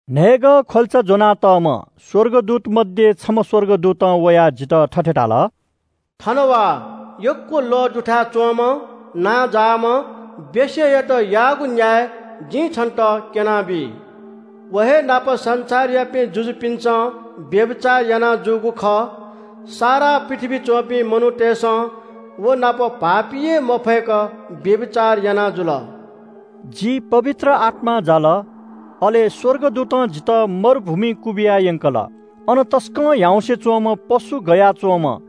न्‍हय्‌गः ख्‍वल्‍चा ज्‍वनातःम्‍ह स्‍वर्गदूत मध्‍ये छम्‍ह स्‍वर्गदूतं वयाः जितः थथे धाल – “थन वा, यक्‍व लः दुथाय् च्‍वंम्‍ह नांजाःम्‍ह वेश्‍यायात याःगु न्‍याय जिं छन्‍त क्‍यनाबी। व हे नाप संसारयापिं जुजुपिन्‍सं व्‍यभिचार याना जूगु खः। सारा पृथ्‍वीइ च्‍वंपिं मनूतय्‌सं व नाप भाःपी हे मफय्‌क व्‍यभिचार याना जुल।” जि पवित्र आत्‍मां जाल, अले स्‍वर्गदूतं जितः मरुभूमिइ क्‍वबिया यंकल। अन तसकं ह्याउँसे च्‍वंम्‍ह पशु गया च्‍वंम्‍ह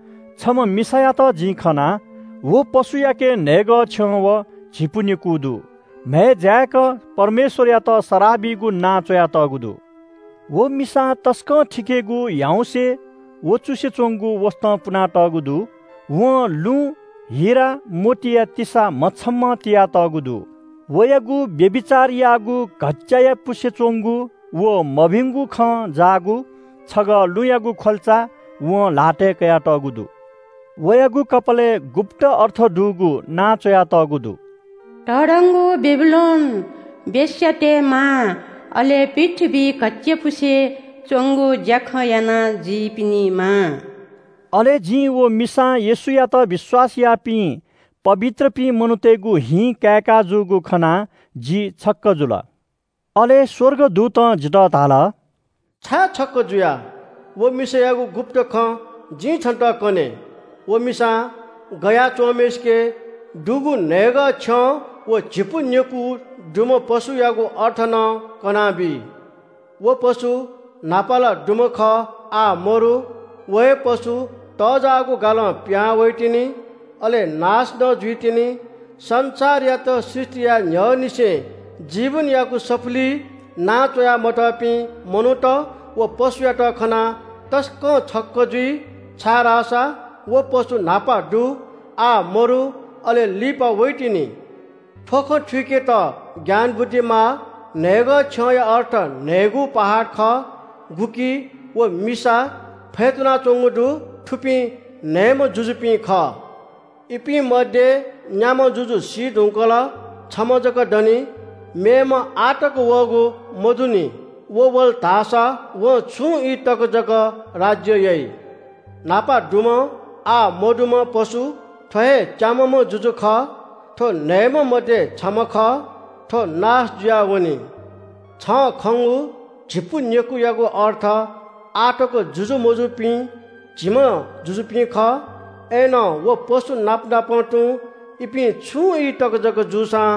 छम्‍ह मिसायात जिं खना। व पशुयाके न्‍हय्‌गः छ्यं व झिपु नेकू दु। म्‍हय् जाय्‌क परमेश्‍वरयात सराः बीगु नां च्‍वयातःगु दु। व मिसां तसकं थिकेगु ह्याउँसे, वँचुसे च्‍वंगु वसतं पुनातःगु दु। वं लुँ, हिरा, मोतीया तिसां म्‍ह छम्‍हं तिया तःगु दु। वयागु व्‍यभिचार याःगु घच्‍चायापुसे च्‍वंगु व मभिंगु खं जाःगु छगः लुँयागु ख्‍वल्‍चा वं ल्‍हातय् कयातःगु दु। वयागु कपालय् गुप्‍त अर्थ दुगु नां च्‍वयातःगु दु – “तःधंगु बेबिलोन, वेश्‍यातय् मां, अले पृथ्‍वीइ घच्‍चायापुसे च्‍वंगु ज्‍याखँ यानाजुइपिनि मां।” अले जिं व मिसां येशूयात विश्‍वास याःपिं पवित्रपिं मनूतय्‌गु हिं काय्‌काजूगु खनाः जि छक्‍क जुल। अले स्‍वर्गदूतं जितः धाल – “छाय् छक्‍क जुया? व मिसायागु गुप्‍त खँ जिं छन्‍त कने। व मिसां गया च्‍वंम्‍हय्‌सिके दुगु न्‍हय्‌गः छ्यं व झिपु नेकू दुम्‍ह पशुयागु अर्थ नं कनाबी। व पशु न्‍हापा ला दुम्‍ह खः, आः मदु। व हे पशु तःजाःगु गालं पिहां वइतिनि। अले नाश नं जुइतिनि। संसारयात सृष्‍टि याये न्‍ह्यःनिसें जीवनयागु सफुलिइ नां च्‍वया मतःपिं मनूत व पशुयात खनाः तसकं छक्‍क जुइ, छाय्‌धाःसा व पशु न्‍हापा दु, आः मदु, अले लिपा वइतिनि। “थ्‍व खँ थुइकेत ज्ञान बुद्धि माः। न्‍हय्‌गः छ्यंया अर्थ न्‍हय्‌गू पहाड खः। गुकी व मिसा फ्‍यतुनाच्‍वंगु दु। थुपिं न्‍हय्‌म्‍ह जुजुपिं खः। इपिं मध्‍ये न्‍याम्‍ह जुजु सी धुंकल छम्‍ह जक दनि। मेम्‍ह आः तक वःगु मदुनि। व वल धाःसा वं छुं ई तक जक राज्‍य याइ। “न्‍हापा दुम्‍ह, आः मदुम्‍ह पशु थ्‍व हे च्‍याम्‍हम्‍ह जुजु खः, थ्‍व न्‍हय्‌म्‍ह मध्‍ये छम्‍ह खः। थ्‍व नाश जुयावनी। छं खंगु झिपु नेकूयागु अर्थ आः तक जुजु मजूनिपिं झिम्‍ह जुजुपिं खः। अय्‌नं व पशुनाप नाप तुं इपिं छुं ई तक जक जूसां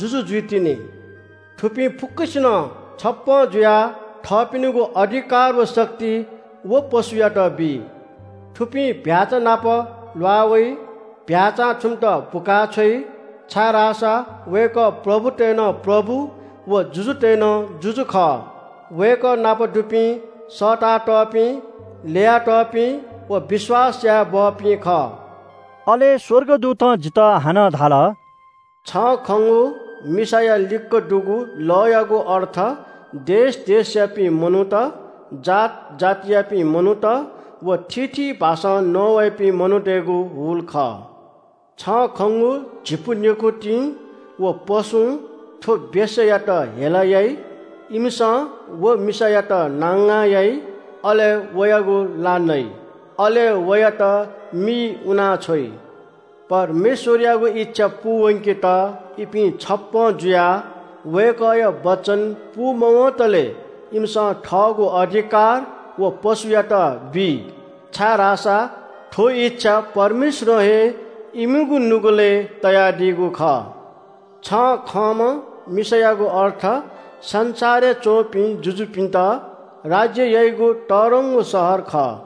जुजु जुइतिनि। थुपिं फुक्‍कसिनं छप्‍पँ जुयाः थःपिनिगु अधिकार व शक्ति व पशुयात बी। थुपिं चीधिकःम्‍ह भ्‍याःचा नाप ल्‍वाः वइ। चीधिकःम्‍ह भ्‍याःचां थुमित बुका छ्वइ, छाय्‌धाःसा वय्‌कः प्रभुतय् नं प्रभु व जुजुतय् नं जुजु खः। वय्‌कः नाप दुपिं सःतातःपिं, ल्‍ययातःपिं व विश्‍वास यायेबहःपिं खः।” अले स्‍वर्गदूतं जितः हानं धाल – “छं खंगु मिसाया लिक्‍क दुगु लःयागु अर्थ देश देशयापिं मनूत, जात जातियापिं मनूत व थीथी भाषां नवाइपिं मनूतय्‌गु हुल खः। छं खंगु झिपु नेकुतिं व पशुं थ्‍व वेश्‍यायात हेला याइ। इमिसं व मिसायात नांगां याइ। अले वयागु ला नइ, अले वयात मिइ उनाछ्वइ। परमेश्‍वरयागु इच्‍छा पूवंकेत इपिं छप्‍पँ जुयाः वय्‌कःया वचन पूमवंतले इमिसं थःगु अधिकार व पशुयात बी, छाय्‌धाःसा थ्‍व इच्‍छा परमेश्‍वरं हे इमिगु नुगलय् तयादीगु खः। छं खंम्‍ह मिसायागु अर्थ संसारय् च्‍वंपिं जुजुपिन्‍त राज्‍य याइगु तःधंगु शहर खः।”